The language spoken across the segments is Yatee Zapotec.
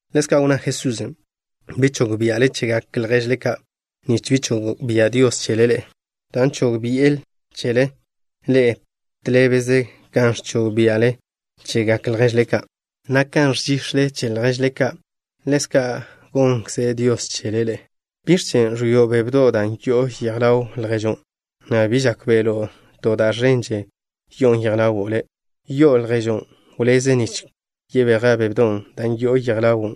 Ḻezka' wnná Jesusen': —Bi chog bia'le chegak lježle ka', nich bi chog bia' Dios chele ḻe'e, dan' chog bi'e chele ḻe'e tḻébeze kan ẕchog bia'le chegak lježle ka', na' kan ẕžix̱le che lježle ka' ḻezkan' gonkze Dios chele ḻe'e. ¿Biẕ chen' ẕwio' bebdo' da' yo'on yej ḻaw lježo', na' bi žákbe'lo' to da' ẕenḻe'e yo'on yej ḻawo' le'? ¿Yi'o lježon': “Wleze, nich kweja' bebdon' da' yo'on yej ḻawo'”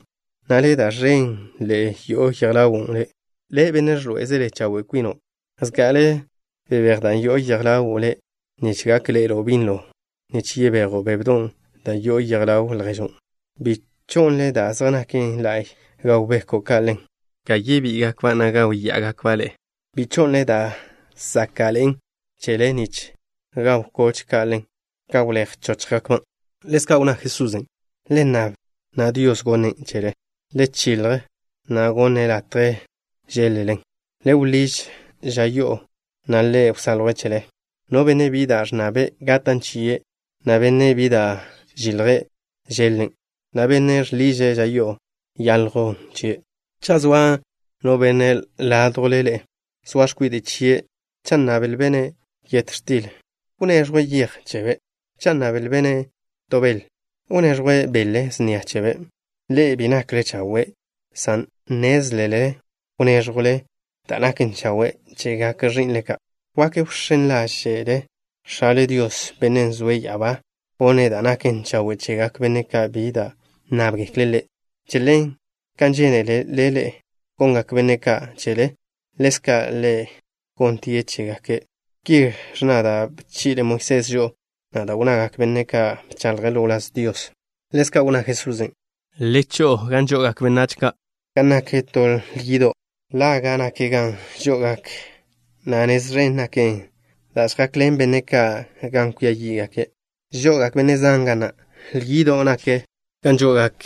na' le', da' ẕenḻe'e yo'on yej ḻawo' le'? Le', benne' žḻoé'ezele chawe' kwino'. Zga'ale wléj da' yo'on yej ḻawo' le', nich gak ḻe'elo' binlo nich kwejo' bebdon' da' yo'on yej ḻaw lježon'. ’Bi cho'nle da' zej naken la'y nich gaw beko' ka' ḻen, ka chéchjgakba', na' gáwya'agakba' ḻe'e. Bi cho'nle da' záka'ḻe'en chele nich gaw koch ka' ḻen, ka wléj chóchjgakban'. Ḻezka' wnná Jesusen': —Le nnab, na' Dios gonnen' chele. Le chilj, na' gonne' latje žéḻ-lelen. Le wḻíž ža yo'o, na' Ḻe' wsaljwe' chele. No benne' bi da' ẕnnabe', gatan' chie', na' benne' bi da' žilje', žeḻ-len', na' benne' žḻiže' ža yo'o, yaljwn chie'. ’Cha' zoa no benne' ládjwle ḻe'e, zoa x̱kwide' chie', cha' nnablbe'-ne' yet x̱til, ¿wneẕjwe' yej chebe'? Cha' nnablbe'-ne' to bel, ¿wneẕjwe' bele snia chebe'? Ḻe'e bi nakle chawe', san nnézlele wnéẕjwle da' naken chawe' chegak ẕi'nle ka'. Wak wx̱én ḻáže'le X̱ale Dios, Bennen' zoe' ya'abá, gonne' da' naken chawe' chegak benne' ka' bi da' nnábgekle' Ḻe'. ’Che ḻen, kan žénelele ḻe'e gongak benne' ka' chele, ḻezka' le gonte chégake'. Ki ẕnna da' bchi'le Moisés žo'o, na' da' wnnagak benne' ka' bcháḻjgake' ḻo wláz Dios. Ḻezka' wnná Jesusen': —Le cho'o gan žo'ogak benách ka' ga nak to lyido'. Laga' nak gan žo'ogak, na' nez ẕen naken da' žjakḻen benne' ka' gan kwia yí'gake'. Žo'ogak benne' zan ga na'. Lyido' nak gan žo'ogak,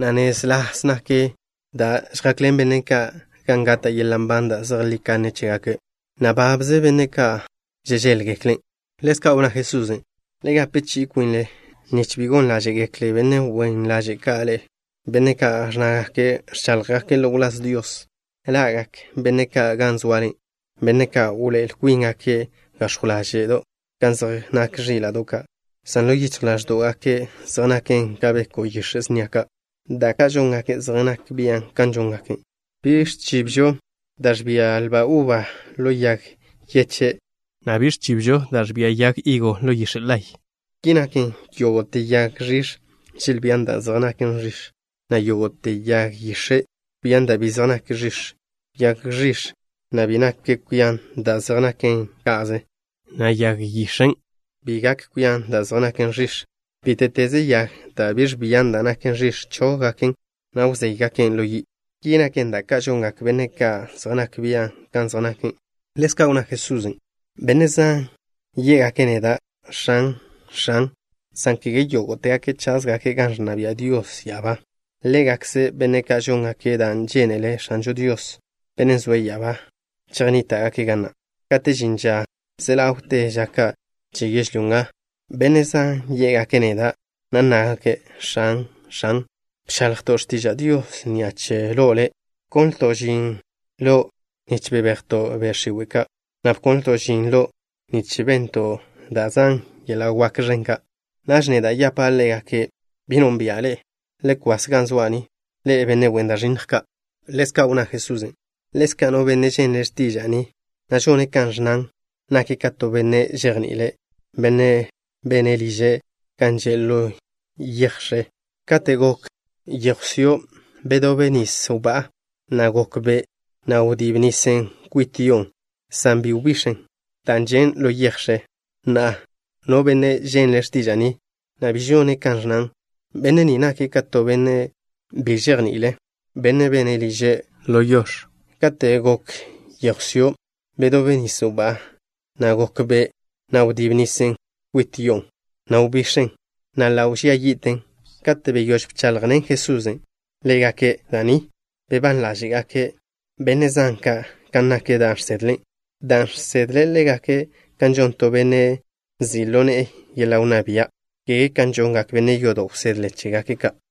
na' nez ḻas naken da' žjakḻen benne' ka' gan gata' yeḻa' nban da' zejlí kanne chégake', na' babze benne' ka' žežéḻgeklen'. Ḻezka' wnná Jesusen': —Le gape chi'i kwinle nich bi gon ḻáže'gekle benne' wen ḻaže' ka' ḻe'e, benne' ka' ẕnnágake' ẕcháḻjgake' ḻo wláz Dios. Ḻa'gak benne' ka' gan zoale, benne' ca' wḻoé'el kwíngake' gax̱jw ḻáže'do' kan zej nak ẕíla'do' ka', san ḻo yichj ḻáẕdo'gake' zej nake' ka beko' yix̱e' snia ka'. Da' ka' žóngake' zej nak bian' kan zej nake'. Bi ẕchibžo da' ẕbia lba uba ḻo yag yeche', na' bi ẕchibžo da' ẕbia yag higo ḻo yix̱e' laye'. Ki naken, yógo'te yag ẕix̱ želbían da' zej naken ẕix̱, na' to yag yix̱e' ẕbian da' bi zej naken ẕix̱. Yag ẕix̱ na' bi gak kwian da' zej naken ka'ze, na' yag yix̱en' bi gak kwian da' zej naken ẕix̱. Bíte'teze yag da' bi ẕbian da' naken ẕix̱, chóggaken', na' wzéygaken' ḻo yi'. Ki naken, da' ka' žongak benne' ka' zej nak bian' kan zej nake'. Ḻezka' wnná Jesusen': —Benne' zan yé'gake' neda': “X̱an, X̱an” san kege yógo'tegake' cházgake' gan ẕnna bia' Dios ya'abá. Ḻégakze benne' ka' žóngake' da' žénele X̱ažo Dios, Bennen' zoe' ya'abá, chejnníta'gake' ga na'. Kate' žin ža ze ḻawte ža ka' che yežlyó nga, benne' zan yé'gake' neda', na' nnágake': “X̱an, X̱an, bchaḻjto' x̱tiža' Dios ni'a che lo' Le'. Bkonlto' žin lo' nich bebejto' be' x̱iwe' ka', na' bkonlto' žin lo' nich bento' da' zan yeḻa' wak ẕen ka'.” Naž neda' yapa' ḻégake': “Bi nónbi'a ḻe'e. Le kwas ga zoa' ni, ḻe'e, benne' wen da' ẕinnj ka'.” Ḻezka' wnná Jesusen': —Ḻezka', no benne' ženle' x̱tiža'a ni, na' žone' kan ẕnnan, nake' ka to benne' žejni'ile', benne' bene' liže' gan že' ḻo yej x̱e. Kate' gok yéjwsio', bedób nis wbá'a, na' gok be', na' wdíb nisen' kwit yo'on', san bi wbix̱en, dan' žen' ḻo yej x̱e. Na'a, no benne' ženle' x̱tiža'a ni, na' bi žone' kan ẕnnan, benne' ni nake' ka to benne' bi žejni'ile', benne' bene' liže' ḻo yo yach. Kate' gok yéjwsio', bedób nis wbá'a, na' gok be', na' wdíb nisen' kwit yo'on', na' wbix̱en, na' ḻa' wbía yi'ten. Kate' beyóž Jesusen' bcháḻjḻene' ḻégake' da' ni, bebán ḻáže'gak benne' zan ka' kan nak da' žsedle', dan' žsedle' ḻégake' kan žon to benne' nzi' ḻo ne'e yeḻa' wnná bia', kege kan žongak benne' yodo' wsedle chégake' ka'.